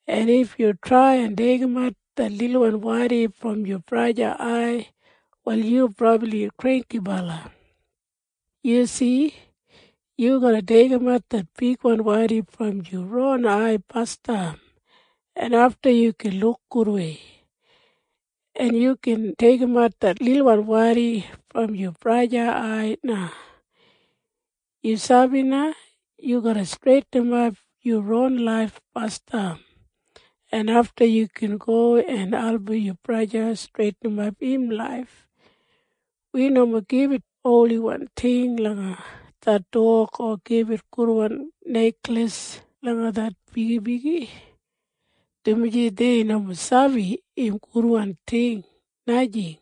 En if yu trai en deigimat det lilwan wadi brom yu braja ai, wal yu brabli granggibala. Yu si? Yu garra deigimat det bigwan wadi brom yu ron ai basdam, en afta yu gin luk gudwei, en yu gin deigimat det lilwan wadi brom yu braja ai na. Yu sabi na? Yu garra streitinimap yu ron laif basdam, en afta yu gin go en album yu braja streitinimap im laif. Wi nomo gibit holiwan ting langa det dog o gibit gudwan nekleis langa det bigibigi, dumaji dei nomo sabi im gudwan ting, najing.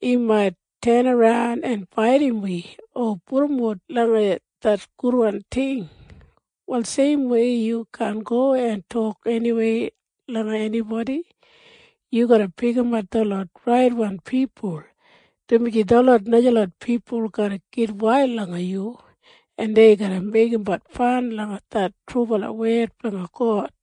Im mait tenaran en baidim wi o pudumbut langa det gudwan ting. Wal seimwei yu garra jinggabat langa hu yu garra tok. Yu garra pikimat detlot raitwan pipul, dumaji detlot najalot pipul mait gitwail langa yu, en dei garra meigimbat fan langa det trubala wed blanga God.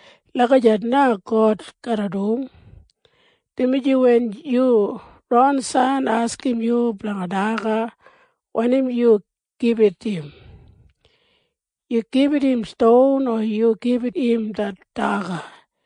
Lagijat na God garra dum. Dumaji wen yu ron san askim yu blanga daga, wanim yu gibit im? Yu gibit im ston? Nomo! Yu gibit im det daga.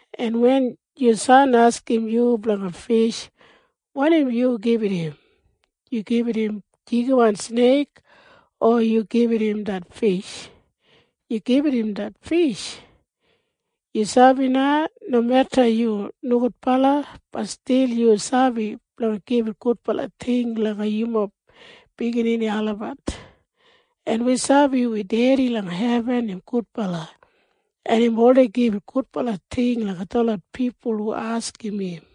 En wen yu san askim yu blanga fish, wanim yu gibit im? Yu gibit im jigiwan sneik? Nomo! Yu gibit im det fish. Yu sabi na? Nomeda yu nogudbala, bat stil yu sabi blanga gibit gudbala ting langa yumob biginini olabat. En wi sabi wi Dedi langa hebin im gudbala, en im oldei gibit gudbala ting langa detlot pipul hu askim im.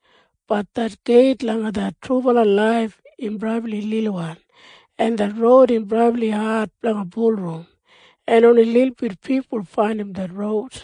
Bat det geit langa det trubala laif im brabli lilwan, en det roud im brabli ad blanga bulurrum, en oni lilbit pipul faindim det roud.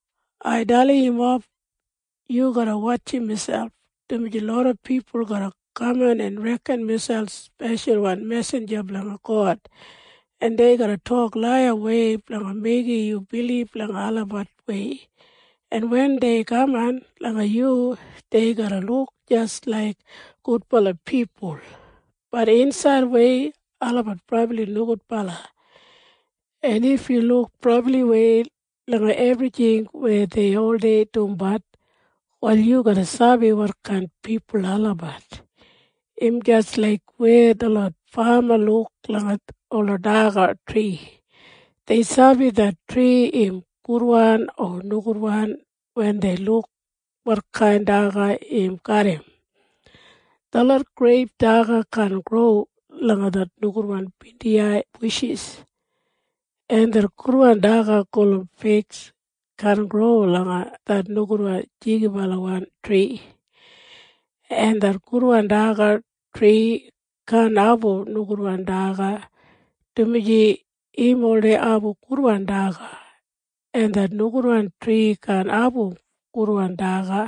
“Ai dalim yumob. Yu garra wotjim miselp, dumaji loda pipul garra kaman en reken miselp speshalwan mesinja blanga God, en dei garra tok laiyawei blanga meigim yu bilib langa olabat wei. En wen dei kaman langa yu, dei garra luk jis laik gudbala pipul. Bat insaidwei olabat brabli nogudbala. En if yu luk brabliwei langa ebrijing weya dei oldei dumbat, wal yu garra sabi wotkain pipul olabat. Im jis laik weya detlot fama luk langa ola daga tri. Dei sabi det tri im gudwan o nogudwan wen dei luk wotkain daga im garram. Detlot greip daga kaan gro langa det nogudwan bindiyai bushis, en det gudwan daga gulum fig kaan gro langa det nogudwan jigibalawan tri. En det gudwan daga tri kaan abum nogudwan daga, dumaji im oldei abum gudwan daga. En det nogudwan tri kaan abum gudwan daga,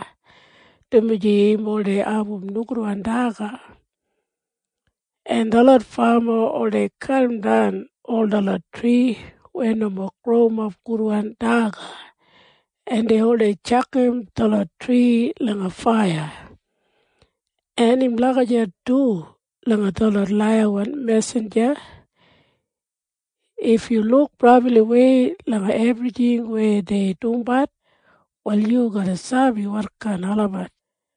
dumaji im oldei abum nogudwan daga. En detlot fama oldei kadimdan ol detlot tri weya nomo growimap gudwan daga, en dei oldei tjakam detlot tri langa faiya. En im lagijat du langa detlot laiyawan mesinja. If yu luk brabliwei langa ebrijing weya dei dumbat, wal yu garra sabi wotkain olabat.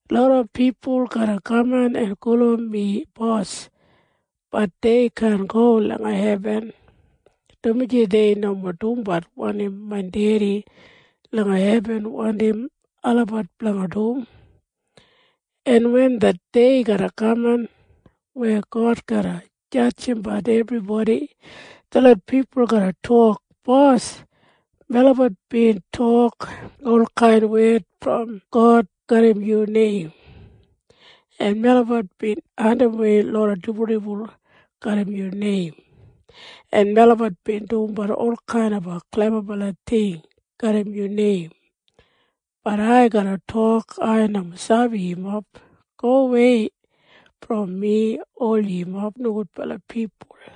“Loda pipul garra kaman en gulum mi Bos. Bat dei kaan go langa hebin, dumaji dei nomo dumbat wanim main Dedi langa hebin wandim olabat blanga dum, en wen det dei garra kaman weya God garra jadjimbat ebribodi, detlot pipul garra tok, ‘Bos, melabat bin tok olkain wed brom God garram yu neim, en melabat bin andimwei loda dibuldibul garram yu neim, en melabat bin dumbat olkain klebabala ting garram yu neim!’ Bat ai garra tok, ‘Ai nomo sabi yumob. Gowei brom mi ol yumob nogudbala pipul!’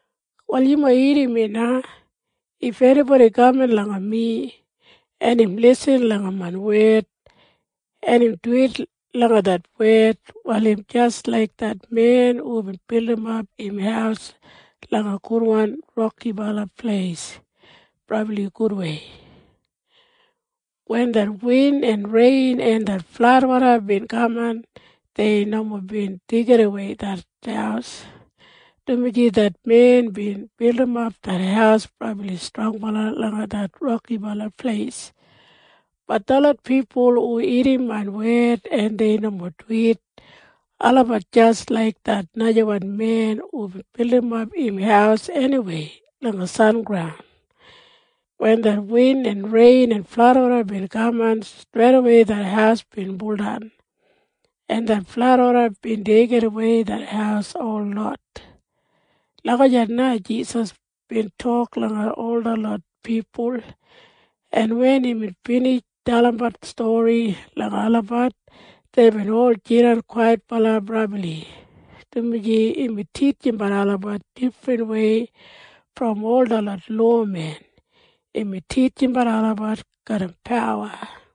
“Wal yumob irrim mi na. If enibodi kaman langa mi, en im lisin langa main wed, en im duwit langa det wed, wal im jis laik det men hubin bildimap im haus langa gudwan rokibala pleis brabli gudwei. Wen det win en rein en det fladwoda bin kaman, dei nomo bin deigidawei det haus, dumaji det men bin bildimap det haus brabli strongbala langa det rokibala pleis. Bat detlot pipul hu irrim main wed, en dei nomo duwit, olabat jis laik det najawan men hubin bildimap im haus eniwei langa sengraun. Wen det win en rein en fladwoda bin kaman, streidawei det haus bin buldan, en det fladwoda bin deigidawei det haus holot.” Lagijat na Jisas bin tok langa ol detlot pipul, en wen imbin binij dalimbat stori langa olabat, deibin ol jidan brabli kwaitbala, dumaji imbin titjimbat olabat difrinwei brom ol detlot lowamen. Imbin titjimbat olabat garram pawa.